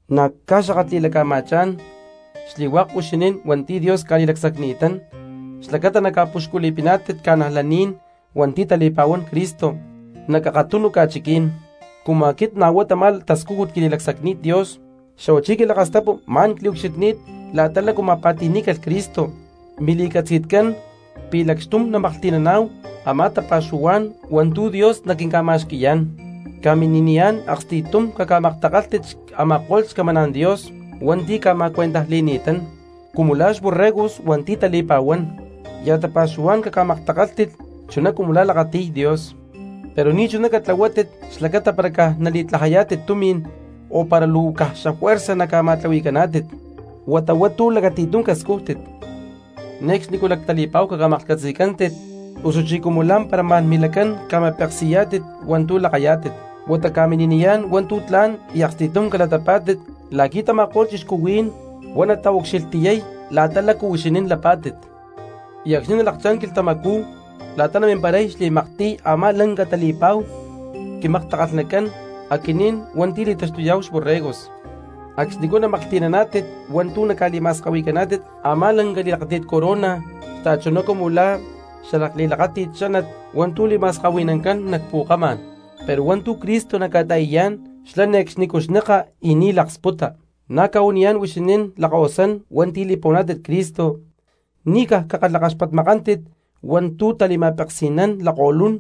Na̠ cca̠xakatli̠laca̠ma̠chá̠n xli̠hua̠k huixinín hua̠nti̠ Dios ca̠li̠lacsacni̠tán xlacata naca̠puxculi̠piná̠tit cristianos hua̠ntí tali̠pa̠huán Cristo nac akatunu ca̠chiquí̠n, cumu aquit na̠ huá tamá tascújut quililacsacni̠t Dios; xa̠huachí quilakastapu ma̠n cliucxilhni̠t la̠ta lácu ma̠pa̠ti̠ní̠calh Cristo, mili̠catzi̠tcán pi̠ lacxtum namaklhti̠naná̠hu a̠má tapa̠xuhuá̠n hua̠ntu̠ Dios naquinca̠ma̠xqui̠yá̠n. Ca̠mini̠niyá̠n aksti̠tum caca̠maktakálhtit a̠ma̠ko̠lh xcamaná̠n Dios hua̠nti̠ ca̠ma̠cuentajli̠ni̠tán, cumu la̠ xborregos hua̠nti̠ tali̠pa̠huán, ya̠ tapa̠xuhuá̠n caca̠maktakálhtit chuná cumu la̠ lakati̠y Dios, pero ni̠chuná catlahuátit xlacata para nali̠tlajayá̠tit tumi̠n o para luu caj juerza ca̠ma̠tlahui̠pa̠cántit, huata hua̠ntu̠ lacati̠tum cascújtit. Ne̠cxnicú lactali̠pa̠hu caca̠maklhcatzi̠cántit osuchí cumu lá̠mpara ma̠n milacán ca̠ma̠peksi̠yá̠tit hua̠ntu̠ lakayá̠tit, huata ca̠mini̠niyá̠n hua̠ntu̠ tla̠n y aksti̠tum calatapá̠tit la̠qui̠ tama̠ko̠lh cristianos huá nataucxilhtiyay la̠ta lácu huixinín lapá̠tit. Y acxni nalakchá̠n quilhtamacú la̠ta namimparay xli̠maktiy a̠má lanca tali̠pa̠hu quimaktakalhnacán aquinín hua̠nti̠ li̠taxtuyá̠hu xborregos, acxnicú namaklhti̠naná̠tit hua̠ntu̠ naca̠li̠ma̠skahui̠caná̠tit a̠má lanca li̠lakáti̠t corona xta̠chuná cumu la̠ xalakli̠lakáti̠t xánat hua̠ntú li̠ma̠skahui̠nancán nac pu̠kamá̠n, pero hua̠ntu̠ Cristo naca̠ta̠i̠yá̠n xlá ne̠cxnicú xneka y ni̠ laksputa. Na̠ cca̠huaniyá̠n huixinín lakkahuasán hua̠nti̠ li̠pa̠huaná̠tit Cristo, ni̠ caj cakalhakaxpatmakántit hua̠ntu̠ tali̠ma̠peksi̠nán lakko̠lún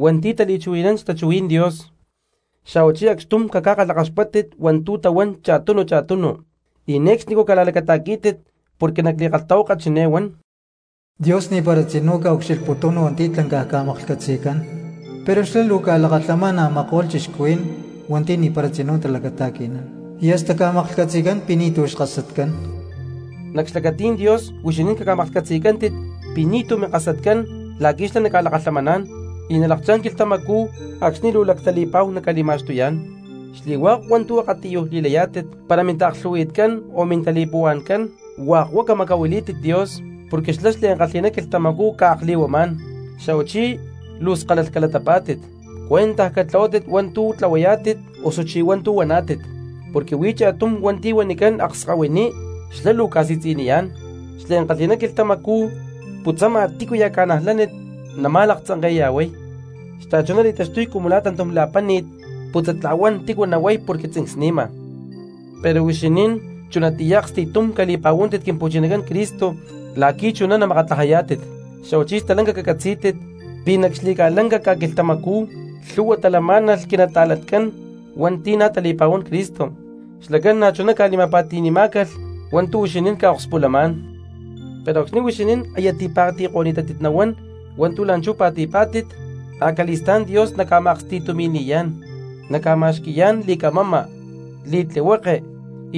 hua̠nti̠ tali̠chuhui̠nán xtachuhuí̠n Dios, xa̠huachí acxtum caca̠kalhakaxpátit hua̠ntu̠ tahuán cha̠tunu cha̠tunu, y ne̠cxnicú cala̠lacata̠quí̠tit porque nac li̠kalhtahuaka chiné huán: Dios ni̠para tzinú ca̠ucxilhputún hua̠nti̠ tlancaj ca̠maklhcatzi̠cán, pero xlá luu ca̠lakalhamán a̠ma̠ko̠lh cristianos hua̠nti̠ ni̠para tzinú talacata̠qui̠nán, y hasta ca̠maklhcatzi̠cán pi̠ ni̠tu̠ xkasatcán. Nac xlacatí̠n Dios huixinín caca̠maklhcatzi̠cántit pi̠ ni̠túcu minkasatcán la̠qui̠ xlá naca̠lakalhamaná̠n, y nalakchá̠n quilhtamacú acxni luu lactali̠pa̠hu naca̠li̠ma̠xtuyá̠n. Xli̠hua̠k hua̠ntu̠ akatiyuj li̠layá̠tit para mintaaklhu̠hui̠tcán o mintali̠puhua̠ncán, hua̠k huá camacahuilí̠tit Dios, porque xlá xliankalhi̠ná quilhtamacú ca̠akli̠huamá̠n. Xa̠huachí luu skalalh calatapá̠tit, cuentaj catlahuátit hua̠ntú tlahuayá̠tit osuchí hua̠ntu̠ huaná̠tit, porque huí cha̠tum hua̠nti̠ huanicán akskahuiní xlá luu ca̠si̠tzi̠niyá̠n, xliankalhi̠ná quilhtamacú putzama tícuya̠ cristiano nama̠laktzanke̠ya̠huay, xta̠chuná li̠taxtuy cumu la̠ tantum la̠páni̠t putzatla̠huán xatícu nahuay porque tzincsni̠ma. Pero huixinín chunatiyá aksti̠tum cali̠pa̠huántit Quimpu̠chinacán Cristo la̠qui̠ chuná namakatlajayá̠tit, xa̠huachí stalanca cacatzí̠tit pi̠ nac xli̠ca̠lanca ca̠quilhtamacú lhu̠hua talamá̠nalh quinata̠lancán hua̠nti̠ na̠ tali̠pa̠huán Cristo, xlacán na̠chuná ca̠li̠ma̠pa̠ti̠ni̠má̠calh hua̠ntu̠ huixinín ca̠akspulamá̠n. Pero acxni̠ huixinín aya tipa̠ti̠ko̠ni̠tátit nahuán hua̠ntu̠ la̠nchú pa̠ti̠pá̠tit, acali̠stá̠n Dios naca̠ma̠aksti̠tumi̠li̠yá̠n, naca̠ma̠xqui̠yá̠n li̠camama, li̠tlihueke,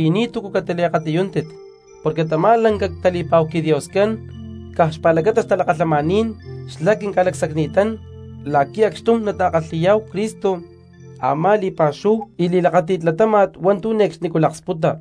y ni̠túcu catiliakatiyúntit, porque tamá lanca tali̠pa̠hu quiDioscán caj xpa̠lacata xtalakalhamaní̠n xlá quinca̠tasanini̠tán la̠qui̠ acxtum nata̠kalhi̠yá̠hu Cristo a̠má li̠pa̠xúhu y li̠lakáti̠t latáma̠t hua̠ntu̠ ne̠cxnicú laksputa.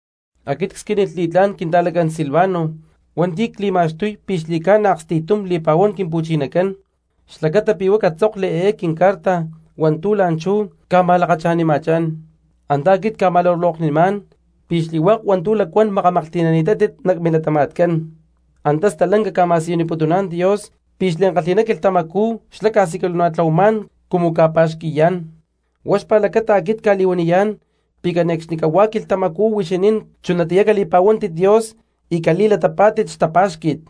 Aquit csquínilh li̠tlá̠n quinta̠lacán Silvano hua̠nti̠ cli̠ma̠xtuy pi̠ xli̠ca̠na aksti̠tum li̠pa̠huán Quimpu̠chinacán, xlacata pi̠ huá catzókli eé quincarta hua̠ntu̠ la̠nchú cca̠ma̠lakacha̠nima̠chá̠n, antá aquit cca̠ma̠luloknimá̠n pi̠ xli̠hua̠k hua̠ntu̠ lacuán makamaklhti̠nani̠tátit nac milatama̠tcán, antá stalanca ca̠ma̠siyuniputuná̠n Dios pi̠ xliankalhi̠ná quilhtamacú xlá ca̠siculana̠tlahuamá̠n cumu ca̠pa̠xqui̠yá̠n, huá xpa̠lacata aquit cca̠li̠huaniyá̠n pi̠ cane̠cxnicahuá quilhtamacú huixinín chunatiyá cali̠pa̠huántit Dios y cali̠latapá̠tit xtapá̠xqui̠t.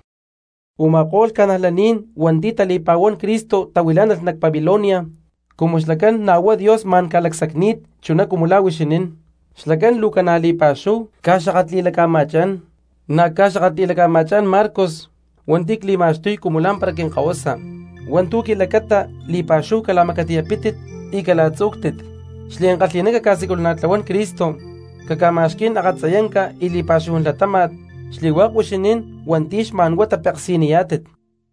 Uma̠kó̠lh cristianos hua̠nti̠ tali̠pa̠huán Cristo tahuilá̠nalh nac Babilonia, cumu xlacán na̠ huá Dios ma̠n ca̠lacsacni̠t chuná cumu la̠ huixinín, xlacán luu ca̠na li̠pa̠xúhu ca̠xakatli̠laca̠ma̠chá̠n; na̠ ca̠xakatli̠laca̠ma̠chá̠n Marcos hua̠nti̠ cli̠ma̠xtuy cumu lá̠mpara quinkahuasa. Hua̠ntu̠ quilacata li̠pa̠xúhu cala̠macatiyapítit y cala̠tzú̠ctit. Xliankalhi̠ná caca̠siculana̠tlahuán Cristo, caca̠ma̠xquí̠n akatziyanca y li̠pa̠xúhu latáma̠t xli̠hua̠k huixinín hua̠nti̠ xma̠n huá tapeksi̠niyá̠tit.